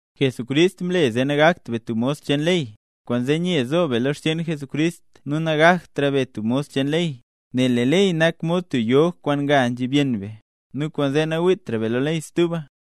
Jesucrist mle zee nagakt be tub mos cheen ley. Kwaanzee, nye zo be lo xcheen Jesucrist nu nagaktra be tub mos cheen ley, nel lee ley nak mod tub yog kwaan nga nzhib yenn be, nu kwaanzee nawiitra be lo ley stuba.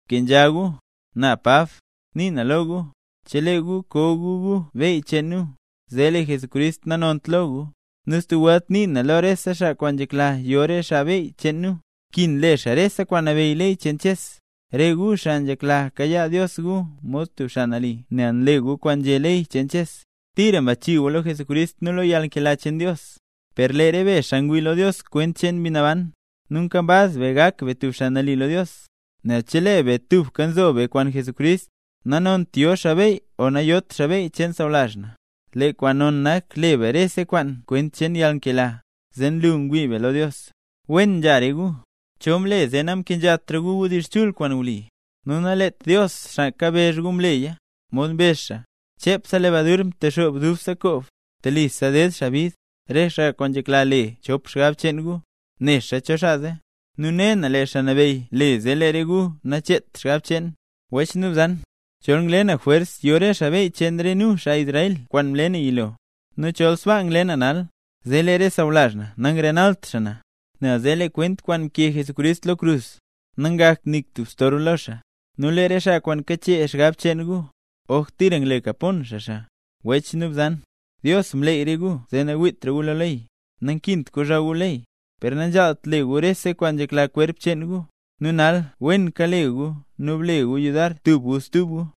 Bkenzha gu. Na Pab, nii na lo gu. Chelee gu ko gu gu beyy cheen nu, zee lee Jesucrist nanont lo gu. Nu stub welt nii na lo rese xaa kwaan nzhekla yo re xaa beyy cheen nu, nkin le xaa rese kwaan nabeyy ley cheen Ches. Re gu, xaa nzhekla kayaa Dios gu mod tub xaa nali nel nle gu kwaan nzhé ley cheen Ches, tira mbachii gu lo Jesucrist nu lo yalnkela cheen Dios. Per re be ngwii lo Dios kwent cheen Mbi Naban, nu nkambaz be gak be tub xaa nali lo Dios. Nel chelee be tubka nzo be kwaan Jesucrist, nanont yo xaa beyy o nayot xaa beyy cheen sawlazh na. Lee kwaan non nak le be rese kwaan kwent cheen yalnkela, zee nlu ngwii be lo Dios. Wen nzha re gu. ¿Cho mle zee namkenzhatra gu wdizh chul kwaan wli? Nu naleet Dios xaa kabezh gu mleya. Mod mbezh xaa: “Chepse lebadur ntexoob dubse koob”. Telisa ded xaa bid, re xaa kwaan nzhekla le chop xgab cheen gu, nexa cho xaa zee. Nu ne na lee Xaa Nabeyy, le zee lee re gu nacheet xgab cheen. Wech nu bzan, chol ngle na jwers yo re xaa beyy cheen nu, xaa Israel, kwaan mle na yilo; nu chol sbaa ngle na nal, zee lee re sawlazh na nangrenalt na, nel zee lee kwent kwaan mkee Jesucrist lo krus, nangakt nik tub storb lo xaa. Nu lee re xaa kwaan kachee xgab cheen gu, ¡oj tira ngle kapon xaa xaa! Wech nu bzan, Dios mleey re gu zee nawiitra gu lo ley. Nakint kozhaw gu ley, per nanzhaalt le gu rese kwaan nzhekla kwerp cheen gu. Nu nal wen kela gu nu ble gu yudar tub gu stub gu.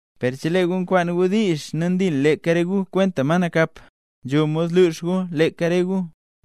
Per chelee gu nkwaan gu diizh nu ndil leeka re gu kwenta ma nakap, nzho mod lux gu leeka re gu.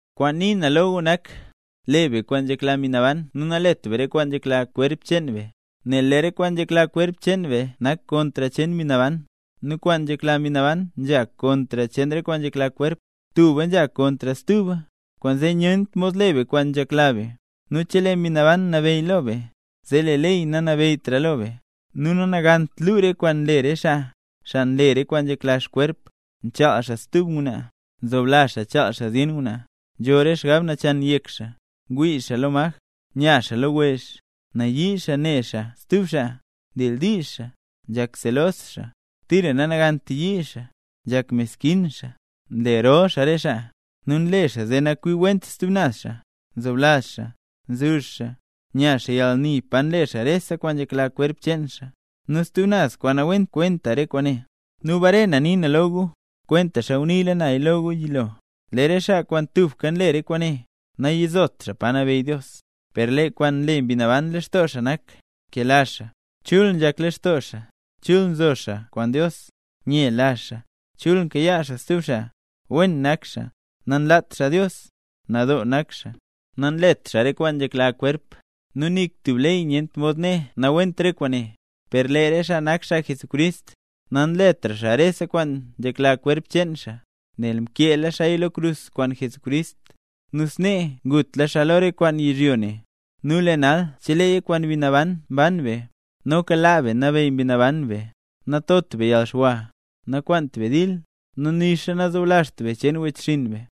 Kwaan nii na lo gu nak: Le be kwaan nzhekla Mbi Naban nu nalet be re kwaan nzhekla kwerp cheen be. Nel lee re kwaan nzhekla kwerp cheen be nzha kontr cheen Mbi Naban, nu kwaan nzhekla Mbi Naban nzha kontr cheen re kwaan nzhekla kwerp. Tuba nzha kontr stuba, kwaanzee nyent mod le be kwaan nzhekla be. Nu chelee Mbi Naban nabeyy lo be, zee lee ley nanabeyytra lo be. Nu nanagant luu re kwaan nle re xaa, xaa nle re kwaan nzhekla xkwerp: nchaal xaa stub ngwnaa, nzoblazh xaa chaal xaa zyen ngwnaa, nzho re xgab nachan yek xaa, ngwii xaa lo maj, nya xaa lo wezh, nayii xaa ne xaa stub xaa, ndildiizh xaa, nzhak selos xaa, tira nanagant yii xaa, nzhak meskin xaa, nle rol xaa re xaa, nu nle xaa zee nakwiwent stub naz xaa, nzoblazh xaa, nzuzh xaa, nya xaa yalni pa nle xaa rese kwaan nzhekla kwerp cheen xaa, nu stub naz kwaan nawent kwenta re kwaane. Nu bare na nii na lo gu, kwentaxa nguniila naya lo gu yilo, lee re xaa kwaan tubka nle re kwaane, nayizot xaa Pa Nabeyy Dios. Per lee kwaan nle Mbi Naban lextoo xaa nak: nkela xaa, chul nzhak lextoo xaa, chul nzo xaa kwaan Dios, nyela xaa, chul nkayaa xaa stub xaa, wen nak xaa, nanlaat xaa Dios, nadoo nak xaa, nanlet xaa re kwaan nzhekla kwerp. Nu nik tub ley nyent mod né nawent re kwaane. Per lee re xaa nak xaa Jesucrist, nanletra xaa rese kwaan nzhekla kwerp cheen xaa, nel mkeela xaaya lo krus kwaan Jesucrist, nu snee ngutla xaa lo re kwaan nak kwaan yizhyo ne. Nu lee nal cheleeya kwaan Mbi Naban mban be, noka laa be nabeyy Mbi Naban be. Natot be yalxwa, nakwaant be dil, nu nixa nazoblazht be cheen wechxinn be.